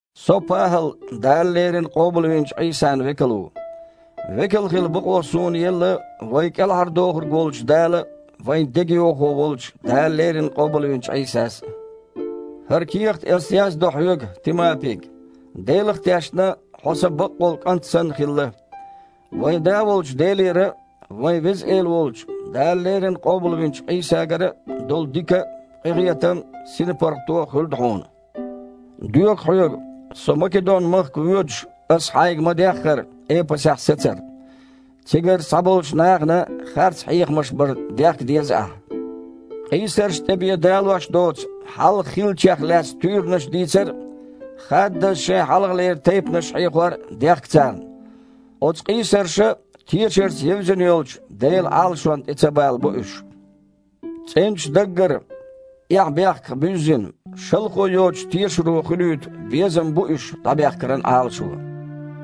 Со, ПахІал, Дала леррина къобалвинчу Іийсан векал ву. Векал хила бакъо суна елла вайн КІелхьардохург волчу Дала а, вайн дегайовхо волчу Дала леррина къобалвинчу Іийсас а. ХІара кехат ас яздо хьоьга, Тимапига. Делах а тешна, хьо сан бакъволу кІант санна хилла. Вайн Да волчу Делера а, вайн Веза Эла волчу, Дала леррина къобалвинчу Іийсагара а долу дика а, къинхетам а, синпаргІато а хуьлда хьуна. Доьху хьоьга, со Македон-махка воьдуш, аса хьайга ма-деххара, Эпасехь сацар. Цигарчу цхьаболчу нахана харц хьехамаш бар дехка деза ахь. Къийсаршна тІе бен далош доцу хьалха хиллачех лаьцна туьйранаш дийцар а, хаддаза шайн хьалхалера тайпанаш хьехор а дехка царна. Оцу къийсарша тешарца евзина йолчу Делан Іалашонна тІе ца балабо уьш. ЦІеначу даггара, эхь-бехках буьззина, шалхо йоцучу тешаро хуьлуьйту безам бу уьш дІабехкаран Іалашо.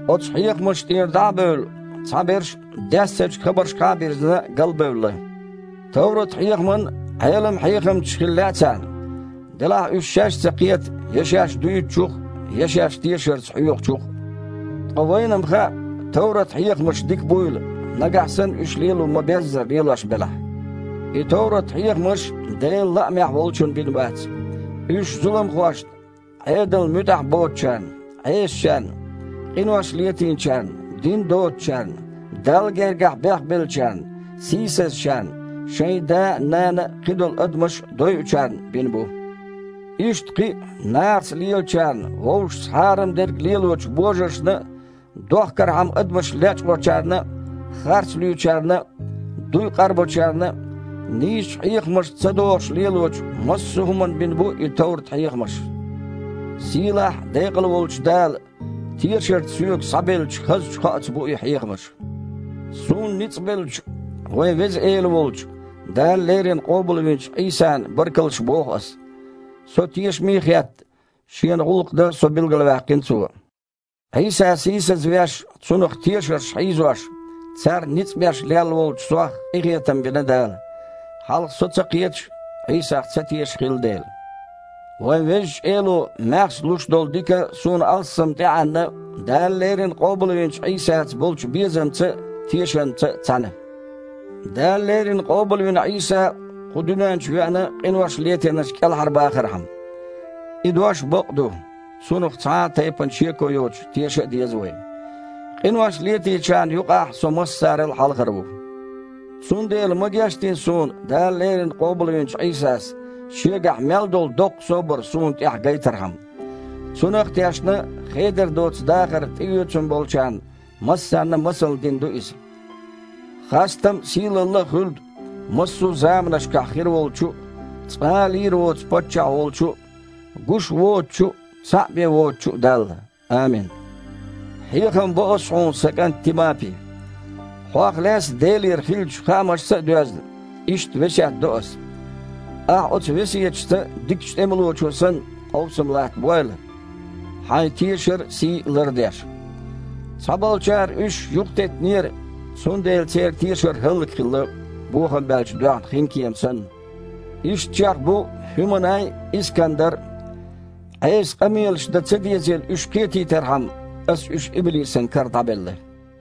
Оцу хьехамашна тІера дІа а бевлла, цхьаберш, даьссачу хабаршкахьа а бирзина, галбевлла. Товрат-хьехаман Іелам-хьехамчаш хила лаьа царна. Делахь а уьш шаьш а ца кхета я шаьш дуьйцучух я шаьш тешарца хьоьхучух. Ткъа вайна-м хаьа, товрат-хьехамаш дика буйла, нагахь санна уьш лело ма-беззара лелош белахь. И товрат-хьехамаш Делан лаамехь волчунна бина бац. Уьш зуламхошна, Іедална муьтІахь боцучарна, Іесачарна, къинош летийначарна, дин доцучарна, Далла гергахь бехбеллачарна, сийсазчарна, шайн да а, нана а, кхидолу адамаш а дойучарна бина бу. Иштта кхин а нахаца лелачарна а, вовшашца хьарам дерг лелочу божаршна а, дохкархьама адамаш лечкъочарна а, харц луьйчарна а, дуй къарбочарна а, нийсачу хьехамашца ца догІуш лелочу массо а хІуманна бина бу и товрат-хьехамаш. Сийлахь а, декъала а волчу Дала тешарца соьга схьабеллачу хазачу кхоаца бу и хьехамаш. Суна ницкъ беллачу вайн Веза Эла волчу, Дала леррина къобалвинчу Іийсана баркаллаш боху ас. Со тешаме а хетта, Шена гІуллакх дан со билгалваьккхина Цо. Іийса сийсазвеш, Цунах тешарш хьийзош, царна ницкъ беш лелла волчу сох къинхетам бина Дала, хьалха со ца кхеташ а, Іийсах ца тешаш а хилла дела. Вайн Везачу Эло маьхза луш долу дика суна алссам тІеІаьнна Дала леррина къобалвинчу Іийсаца болчу безамца а, тешамца а цхьаьна. «Дала леррина къобалвина Іийса кху дуьнен чу веана къинош летийнарш кІелхьарбахархьама». И дош бакъ а ду, цунах цхьа а тайпана шеко йоцуш теша а деза вай. Къинош летийначарна юкъахь со массарал а хьалхара ву. Цундела ма гечдина суна Дала леррина къобалвинчу Іийсас, Шегахь мел долу доккха собар суна тІехь гайтархьама. Цунах а тешна, хедар доцу дахар тІеоьцун болчарна массарна а масална дина ду иза. Хастам а, сийлалла а хуьлда массо а заманашкахь хир волчу а, цкъа а лийр воцу паччахь волчу а, гуш воцучу а, цхьаъ бен воцучу а Далла. Амин. Хьехам бо ас хьуна, сан кІант Тимапи! Хьох лаьцна Делера хиллачу хаамашца а доьзна, иштта весет до ас. Ахьа оцу весеташца, дикачу тІемалочо санна, къовсам латтабойла, хьайн тешар а, сий а лардеш. Цхьаболчара уьш юхатеттинера, цундела церан тешар хІаллакьхилла, бохам баьлча доьхна хинкема санна. Ишттачех бу ХІуьманай а, Искандар а. Іеса къамелаш дан ца дезийла уьш кхетийтархьама, аса уьш иблисан кара дІабелла.